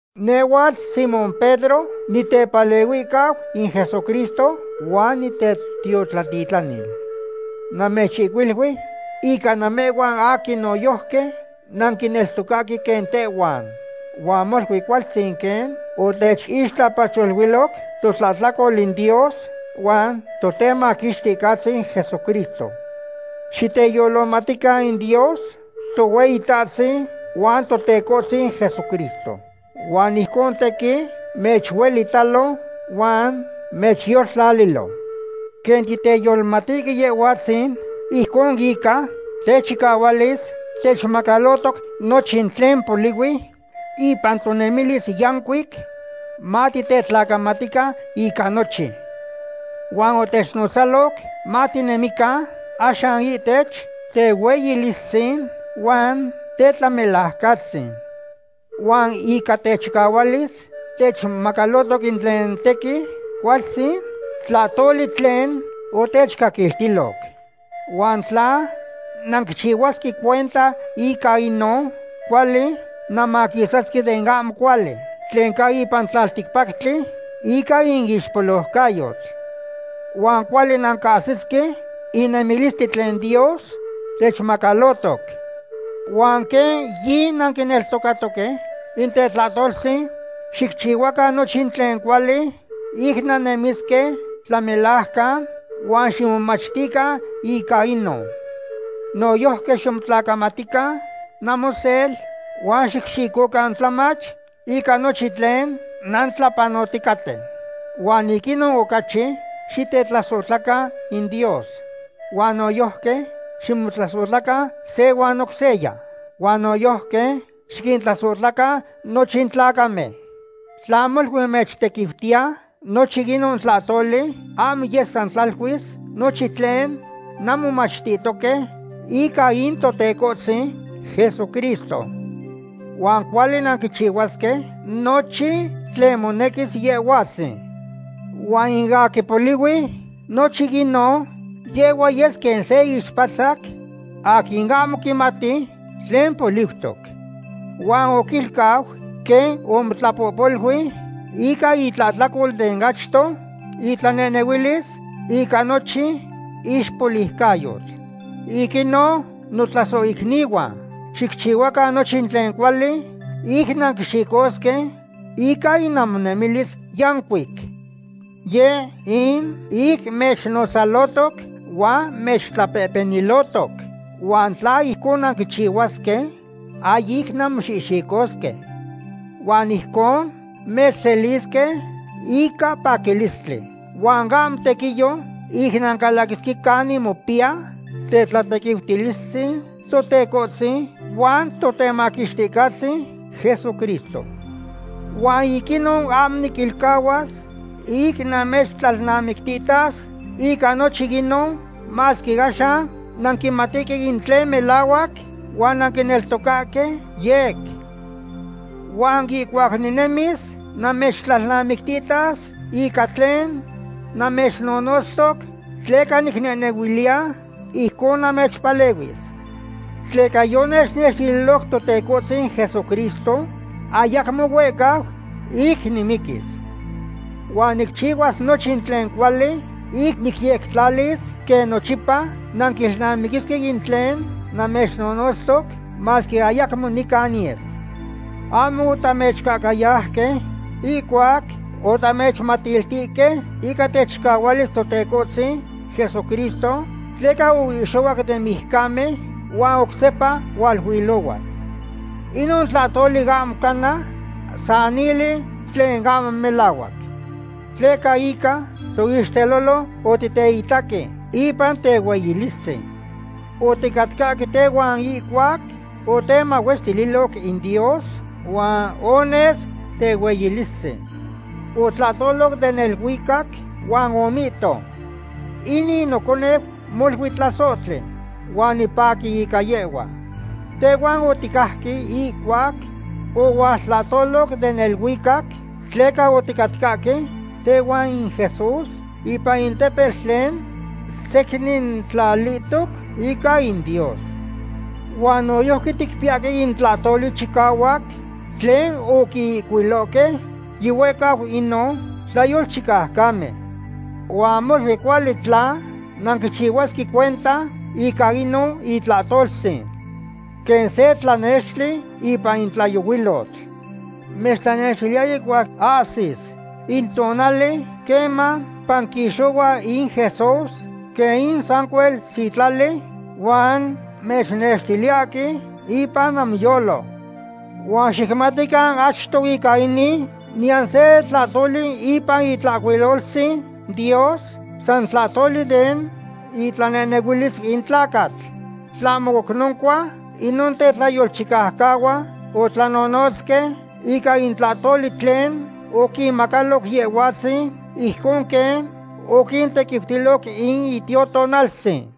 Nehhuatl Simón Pedro, nitepalehuihcau in Jesucristo huan nitetiotlatitlanil. Namechihcuilui ica namehhuan aquin noyojqui nanquineltocahque quen tehhuan. Huan molui cualtzin quen otechixtlapacholuiloc totlahtlacol in Dios huan Totemaquixticahtzin Jesucristo. Xiteyolohmatican in Dios Tohueyitahtzin huan Totecohtzin Jesucristo, huan ijcon tequin mechuelitalo huan mechyoltlalilo. Quen titeyolohmatihque Yehhuatzin, ijcon ica techicahualis techmacalohtoc nochin tlen polihui ipan tonemilis yancuic, matitetlacamatican ica nochin. Huan otechnotzaloc matinehnemican axan ihtech tehueyilistzin huan tetlamelaucatzin. Huan ica techicahualis techmacalohtoc in tlen tequin cualtzin tlahtoli tlen otechcaquiltiloc. Huan tla nanquichihuasque cuenta ica inon, cuali nanmaquisasque den ahmo cuali tlen ca ipan in tlalticpactli ica in ixpoliucayotl. Huan cuali nancahsisque in nemilistli tlen Dios techmacalohtoc. Huan quen yinanquineltocahque in tetlahtoltzin, xicchihuacan nochin tlen cuali ic nannemisque tlamelajcan, huan ximomachtican ica inon. Noyojqui ximotlacamatiltican namosel huan xicxicocan tlamach ica nochin tlen nantlapanoticaten. Huan ic inon ocachi xitetlasohtlacan in Dios. Huan noyojqui ximotlasohtlacan se huan oc seya huan noyojqui xiquintlasohtlacan nochin tlacamen. Tla molui mechtequiutiya nochin inon tlahtoli, ahmo yes san tlaluis nochin tlen nanmomachtihtoque ica in Totecohtzin Jesucristo. Huan cuali nanquichihuasque nochin tlen monequis Yehhuatzin. Huan in aquin polihui nochin inon, yehhua yes quen se ixpatzac aquin ahmo quimati tlen poliutoc. Huan oquilcau quen omotlapohpolui ica itlahtlacol den achto itlanehnehuilis ica nochin ixpoliucayotl. Ic inon, notlasohicnihuan, xicchihuacan nochin tlen cuali ic nanquixicosque ica in namonemilis yancuic. Yeh in ic mechnonotzalohtoc huan mechtlapehpenilohtoc. Huan tla ijcon nanquichihuasque, ahyic nanmoxihxicosque. Huan ijcon mechselisque ica paquilistli huan ahmo tequiyo ic nancalaquisque canin mopiya tetlatequiutilistzin Totecohtzin huan Totemaquixticahtzin Jesucristo. Huan ic inon ahmo niquilcahuas ic namechtlalnamictihtas ica nochin inon, masque axan nanquimatihque in tlen melahuac huan nanquineltocahque yec. Huan ihcuac ninemis namechtlalnamictihtas ica tlen namechnonotztoc, tleca nicnehnehuiliya ijcon namechpalehuis. Tleca yonechnextililoc Totecohtzin Jesucristo ayacmo huehcau ic nimiquis. Huan nicchihuas nochin tlen cuali ic nicyectlalis quen nochipa nanquilnamiquisque in tlen namechnonotztoc masque ayacmo nica niyes. Ahmo otamechcahcayauque ihcuac otamechmatiltihque ica techicahualis Totecohtzin Jesucristo, tleca oihxohuac den mijcamen, huan oc sepa hualuilohuas. Inon tlahtoli ahmo cana sanili tlen ahmo melahuac. Tleca ica toixtelolo otiteitaque ipan tehueyilistzin. Oticatcahque tehuan ihcuac otemahuestililoc in Dios huan ones tehueyilistzin. Otlahtolo den neluicac huan omihto: “Inin noconeu molui tlasohtli, huan nipaqui ica yehhua.” Tehhuan oticajque ihcuac ohualtlahtoloc den neluicac, tleca oticahcatca tehuan in Jesús ipan in tepetl tlen secnintlalihtoc ica in Dios. Huan noyojqui ticpiyahque in tlahtoli chicahuac tlen oquihcuilohque yihuehcau inon tlayolchicaucamen. Huan molui cuali tla nanquichihuasque cuenta ica inon itlahtoltzin. Quen se tlanextli ipan in tlayohuilotl. Mechtlanextiliya ihcuac ahsis in tonali queman panquixohua in Jesús quen in sancuel sitlali huan mechnextiliyahque ipan namoyolo. Huan xicmatican achto ica inin: Niyan se tlahtoli ipan Itlahcuiloltzin Dios san tlahtoli den itlanehnehuilis in tlacatl. Tlahmo oc noncua, inon tetlayolchicaucahuan otlanonotzque ica in tlahtoli tlen oquinmacaloc Yehhuatzin, ijcon quen oquintequiutiloc in Itiotonaltzin.